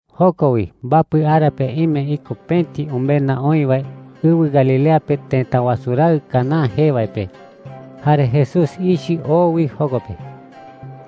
Joko wi mbapɨ ara pe ime iko pëti umenda oï wae ɨwɨ Galilea pe tëta wasu raɨ Caná jee wae pe. Jare Jesús ichɨ oo wi joko pe.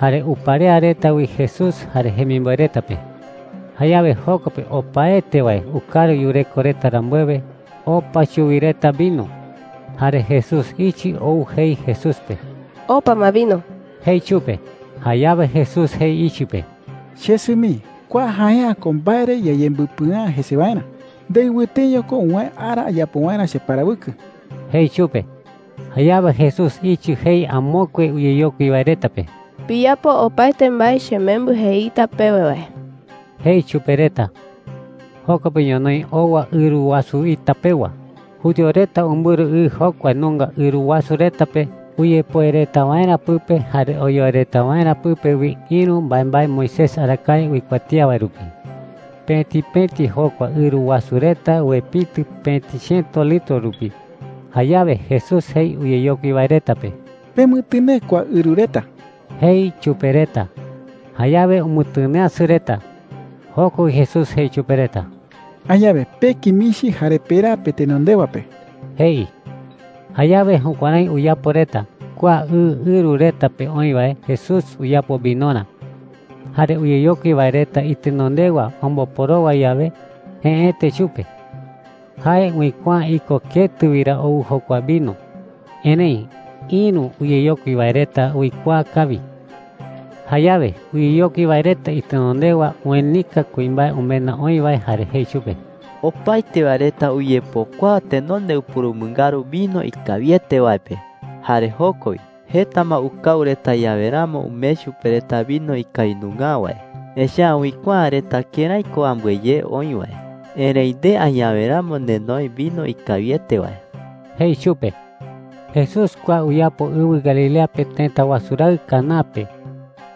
Jare uparea reta wi Jesús jare jemimboe reta pe. Jayawe joko pe opaete wae ukaru yureko reta rambuewe, opa chuwi reta vino. Jare Jesús ichɨ ou jei Jesús pe: “Opa ma vino,” jei chupe. Jayawe Jesús jei ichɨ pe: “Chesɨ mii, kua jae’ä ko mbae re yayembɨpɨa’ä jese waerä. Ndei wɨteño ko uwäe ara ayapo waerä cheparawɨkɨ,” jei chupe. Jayawe Jesús ichɨ jei amokue uyeyokui wae reta pe: “Piyapo opaete mbae chemembɨ jeita pewe wae,” jei chupe reta. Joko pe ñonoï owa ɨru wasu ita pewa. Judío reta umbɨru ɨ jokua nunga ɨru wasu reta pe uyepoe reta waerä pɨpe jare oyoe reta waerä pɨpe wi ïru mbaembae Moisés arakae uikuatía wae rupi. Pëti pëti jokua ɨru wasu reta uepitɨ pëti chiëto litro rupi. Jayawe Jesús jei uyeyokui wae reta pe: “Pemɨtɨnee kua ɨru reta,” jei chupe reta. Jayawe umɨtɨneeasɨ reta. Joko wi Jesús jei chupe reta: “Añawe peki michi jare peraa petenondewa pe,” jei. Jayawe jukuärái uyapo reta. Kua ɨ ɨru reta pe oï wae Jesús uyapo vinorä. Jare uyeyokui wae reta itenondewa omboporowa yawe, jëete chupe. Jae uikuaa’ä iko ketɨ wi ra ou jokua vino, erëi ïru uyeyokui wae reta uikuaa kawi. Jayawe uyeyokui wae reta itenondewa uenika kuimbae umenda oï wae jare jei chupe: “Opaete wae reta uyepokuaa tenonde upurumɨngaru vino ikawiete wae pe. Jare joko wi, jeta ma ukau reta yawe ramo umee chupe reta vino ikawi nunga’ä wae, echa’ä uikuaa’ä reta kërái ko ambɨe ye oï wae. Erëi nde añawe ramo nenoe vino ikawiete wae,” jei chupe. Jesús kua uyapo ɨwɨ Galilea pe tëta wasu raɨ Caná pe.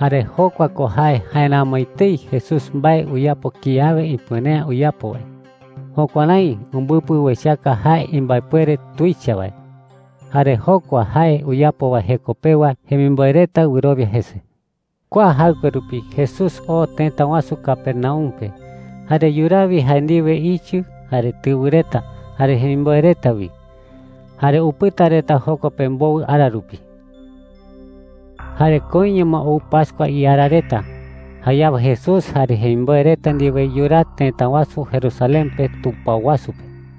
Jare jokua ko jae jaeramo etei Jesús mbae uyapo kiawe ipuere’ä uyapo wae. Jukuärái umbɨpɨ uechaka jae imbaepuere tuicha wae. Jare jokua jae uyapo wae jeko pewa jemimboe reta wɨrowia jese. Kua jaɨkue rupi Jesús oo tëta wasu Capernaum pe. Jare yuraa wi jae ndiwe ichɨ, jare tɨwɨ reta, jare jemimboe reta wi. Jare upɨta reta joko pe mbowɨ ara rupi. Jare koiño ma ou pascua iara reta. Jayawe Jesús jare jemimboe reta ndiwe yuraa tëta wasu Jerusalén pe tupao wasu pe.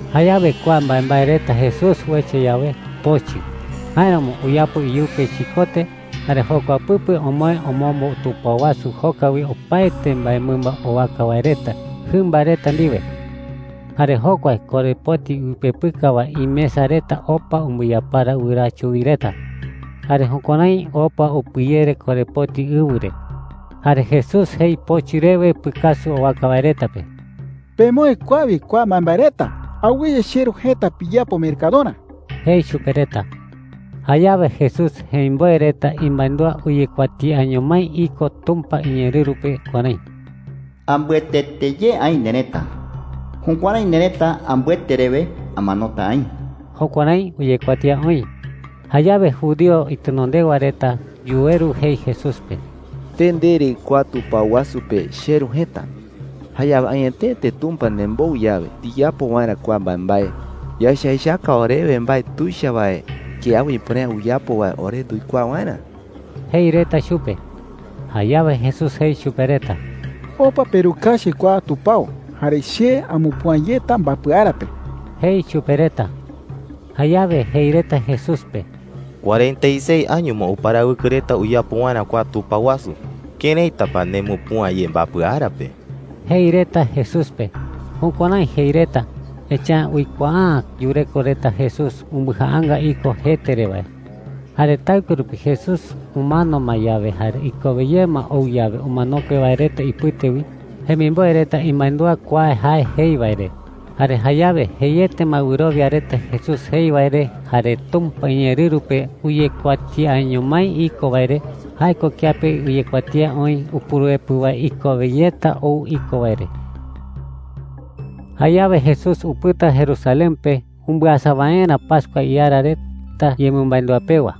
Jayawe kua mbaembae reta Jesús uecha yawe, pochɨ. Jáeramo uyapo iyupe chikote, jare jokua pɨpe omoë omombo tupao wasu joka wi opaete mbaemɨmba owaka wae reta jɨmba reta ndiwe. Jare jokua korepoti uipepɨka wae imesa reta opa umbɨyapara wɨraa chuwi reta. Jare jukuärái opa upɨyere korepoti ɨwɨ re. Jare Jesús jei pochɨ rewe pɨkasu owaka wae reta pe: “¡Pemoë kua wi kua mbaembae reta! Awɨye cheRu jëta piyapo mercadorä,” jei chupe reta. Jayawe Jesús jemimboe reta imandúa uyekuatiaño mái iko Tumpa iñeerɨru pe kuärái: “Ambɨetete ye aï nerëta. Jukuärái nerëta ambɨete rewe amanota aï.” Jukuärái uyekuatía oï. Jayawe judío itenondewa reta yuweru jei Jesús pe: “Nde ndere kua tupao wasu pe ‘cheRu jëta.’ Jayawe añetete Tumpa nembou yawe ndiyapo waerä kua mbaembae, yaecha echaka orewe mbae tuicha wae kiawe ipuere’ä uyapo wae ore nduikuaa waerä,” jei reta chupe. Jayawe Jesús jei chupe reta: “Opa perukachi kua tupao, jare che amupüa yeta mbapɨ ara pe,” jei chupe reta. Jayawe jei reta Jesús pe: “Cuarenta y seis año ma uparawɨkɨ reta uyapo waerä kua tupao wasu. ¿Këraita pa nde nemupüa ye mbapɨ ara pe?” jei reta Jesús pe. Jukuärái jei reta, echa’ä uikuaa’ä yureko reta Jesús umbɨjaanga iko jete re wae. Jare taɨkue rupi, Jesús umano ma yawe jare ikowe ye ma ou yawe umanokue wae reta ipɨte wi, jemimboe reta imandúa kua jae jei wae re. Jare jayawe jeiete ma wɨrowia reta Jesús jei wae re jare Tumpa iñeerɨru pe uyekuatiaño mái iko wae re – jae ko kiape uyekuatía oï Upuruepɨ wae ikowe yeta ou iko wae re. Jayawe Jesús upɨta Jerusalén pe umbɨasa waerä pascua iara reta yemɨmandúa pewa.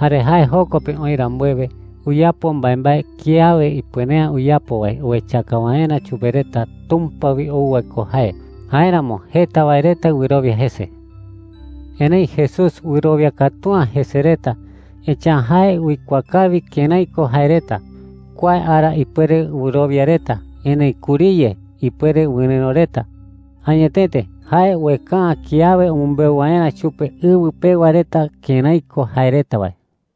Jare jae joko pe oï rambuewe, uyapo mbaembae kiawe ipuere’ä uyapo wae uechaka waerä chupe reta Tumpa wi ou wae ko jae. Jáeramo jeta wae reta wɨrowia jese. Erëi Jesús wɨrowia katu’ä jese reta, echa’ä jae uikuaa kawi kërái ko jae reta. Kua ara ipuere wɨrowia reta, erëi kuriye ipuere wɨrɨ̈ro reta. Añetete, jae ueka’ä kiawe umɨmbeu waerä chupe ɨwɨ pewa reta kërái ko jae reta wae.